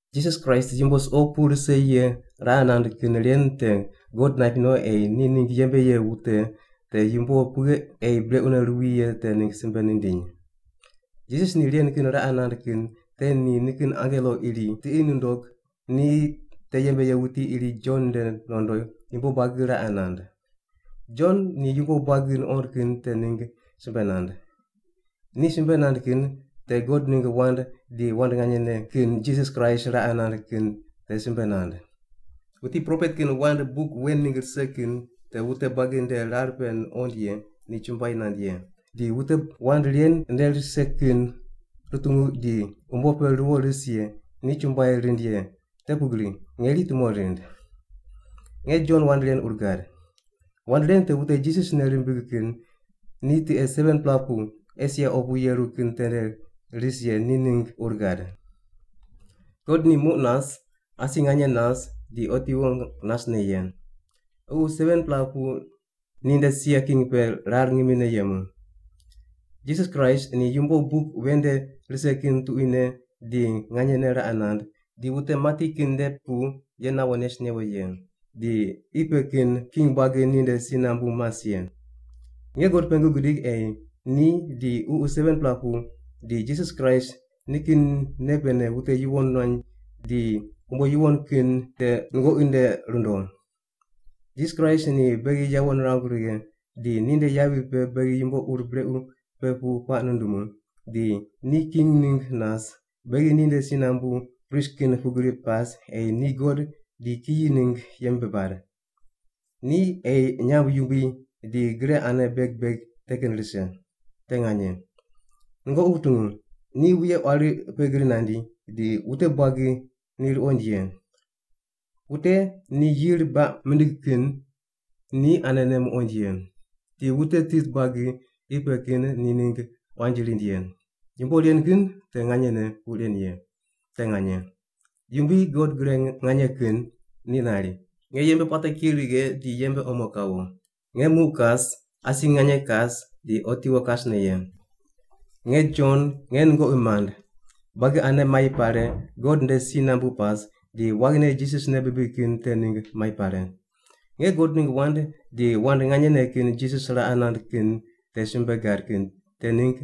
Jisas Kraist yumbo suqo pu rise ye raqe nand kin ren te God naip no ei ni ningg yembe ye wute te yumbo pughe ei brequne ruwi ye te ningg simbe nindiny. Jisas ni ren kin raqe nand kin te ni nikin angelo iri tiqi nundog ni te yembe ye wuti iri Jon nde nondo yumbo buagi raqe nand. Jon ni yumbo buagi nuqond kin te ningg simbe nand. Ni simbe nand kin te God ningg wand di wand nganyene kin Jisas Kraist raqe nand kin te simbe nand. Wuti propet kin wand buk wen ningg rise kin te wute buagi nde rar pe nuqond ye ni chumbuai nand ye, di wute wand ren nde rise kin rutungu di umbo pe ruwo ris ye ni chumbuai rind ye, te pugri ngeri tumo rind. Nge Jon wand ren ur gad. Wand ren te wute Jisas nei rimbig kin ni tiqe 7-pela pu Esia opu yeru kin tende ris ye ni ningg ur gad. God ni muq nas, asi nganye nas, di otiwo nasne ye. Ququ 7-pela pu ninde sia king pe rar ngimine yemu. Jisas Kraist, ni yumbo buk wen nde rise kin tuquine di nganyene raqe nand, di wute mati kin nde pu ye nawo nes newo ye, di qi pe kin king buagi ninde si nambu mas ye. Nge God pengu gidig ei ni di Ququ 7-pela pu di Jisas Kraist ni nikin nei pene wute yuwon muany di umbo yuwon kin te nungoqi nde rundo. Jisas Kraist ni beghi yawo nirangu righe di ninde yavi pe beghi yumbo ur brequ pe pu puaq nundumu, di ni king ningg nas, beghi ninde si nambu prist kin pugri pas ei ni God di kiyi ningg yembe bad. Ni ei nyamb yumbui di gre ane beg beg te kin rise. Te nganye. Nungoqi wutungu, ni wuye quari pe gri nandi, di wute buagi ni ruqoind ye. Wute ni yir baq mindig kin ni anene muqoind ye. Di wute tit buagi qi pe kin ni ningg quanji rind ye. Yumbo ren kin te nganyene puq ren ye. Te nganye. Yumbui God Gre Nganye Kin ni nari, “Nge yembe puate ki righe di yembe omo kawo. Nge muq kas, asi nganye kas di otiwo kasne ye.” Nge Jon nge nungoqi mand, buagi ane mai pare, God nde si nambu pas, di waghine Jisas nei bibig kin te ningg mai pare. Nge God ningg wand di wand nganyene kin Jisas raqe nand kin te simbe gad kin te ningg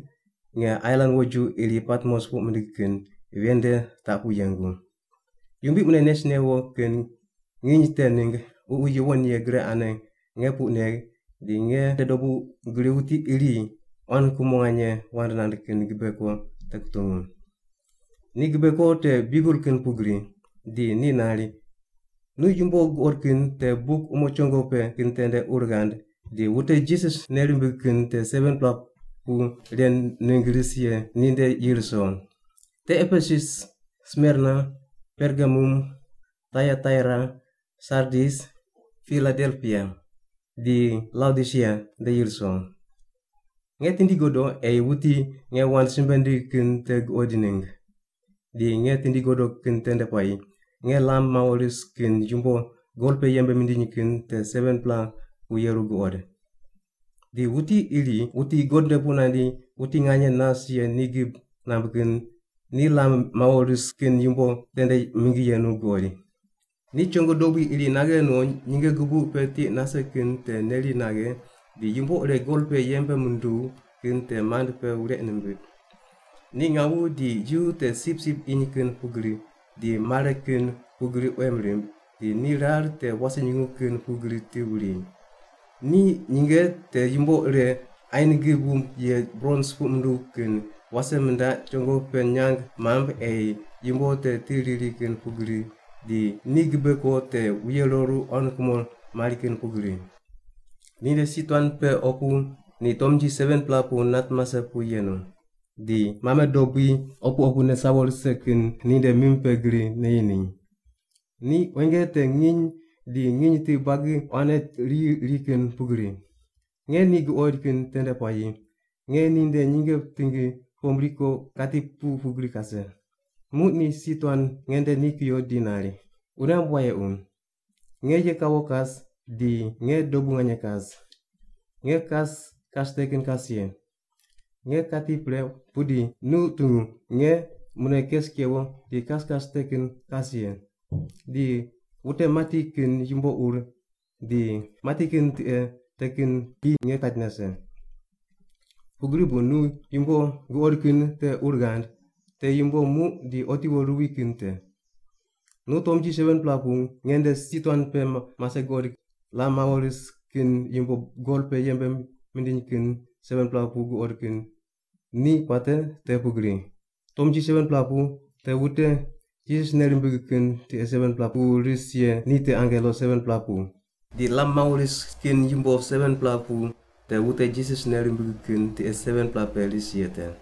nge ailan woju iri Patmos puq mindig kin ven nde taq pu yengu. Yumbui mune nes newo kin nginy te ningg Ququ Yuwon Ye gre ane nge puq negh di nge nde dobu gri wuti iri quan kumo nganye wand nand kin gibe ko te kutungu. Ni gibe ko te biugel kin pugri, di ni nari, “Nu yumbo guqod kin te buk umo chongo pe kin tende ur ghand di wute Jisas nei rimbig kin tiqe 7-pela pu ren ningg ris ye ninde yi ruso: Te Epesus, Smerna, Pergamum, Taiataira, Sardis, Piladelpia di Laodisia nde yi ruso.” Nge tindi godo ei wuti nge wand simbe nindigh kin te guqoid ningg. Di nge tindi godo kin tende puayi nge lam mawo ris kin yumbo gol pe yembe mindiny kin te 7-pela pu yeru guqod. Di wuti iri wuti God nde pu nandi wuti nganye nas ye ni gib namb kin ni lam mawo ris kin yumbo tende mingi yenu guqoid. Ni chongo dobui iri naghe no nyinge gubuq pe tiq nase kin te neri naghe di yumbo ire gol pe yembe munduw kin te mand pe wureq nimbiq. Ni ngawu di yu te sipsip iny kin pugri di mare kin pugri quem rimb, di ni rar te wase nyungu kin pugri ti wuri. Ni nyinge te yumbo ire ain gib wumb ye brons puq munduw kin wase mindaq chongo pe nyang mamb ei yumbo te ti riri kin pugri, di ni gibe ko te wuye roru quan kumo mari kin pugri. Ninde si tuan pe opu ni tomnji 7-pela pu nat mase pu yenu, di mame dobui opu opune sawo rise kin te ninde mim pe gri neyi ni. Ni quenge te nginy di nginy ti buagi quanne riyi ri kin pugri. Nge ni guqoid kin tende puayi nge ninde nyinge tingi pombri ko kati pu pugri kase. Muq ni si tuan nge nde ni kuyo di nari, “Wune ghamb wayequ, nge ye kawo kas di nge dobu nganye kas. Nge te kas kas te kin kas ye. Nge kati pre pudi nu tungu nge mune kes kewo di kas kas te kin kas ye! Di wute mati kin yumbo ur di mati kin tiqe te kin ki nge kait nase. Pugri bu nu yumbo guqod kin te ur ghand, te yumbo muq di otiwo ruwi kin te. Nu tomnji 7-pela pu nge nde si tuan pe mase guqod di lam mawo ris kin yumbo gol pe yembe mindiny kin 7-pela pu guqod kin ni puate te pugri: Tomnji 7-pela pu te wute Jisas nei rimbig kin tiqe 7-pela pe ris ye ni te angelo 7-pela pu, di lam mawo ris kin yumbo 7-pela pu te wute Jisas nei rimbig kin tiqe 7-pela pe ris ye te.”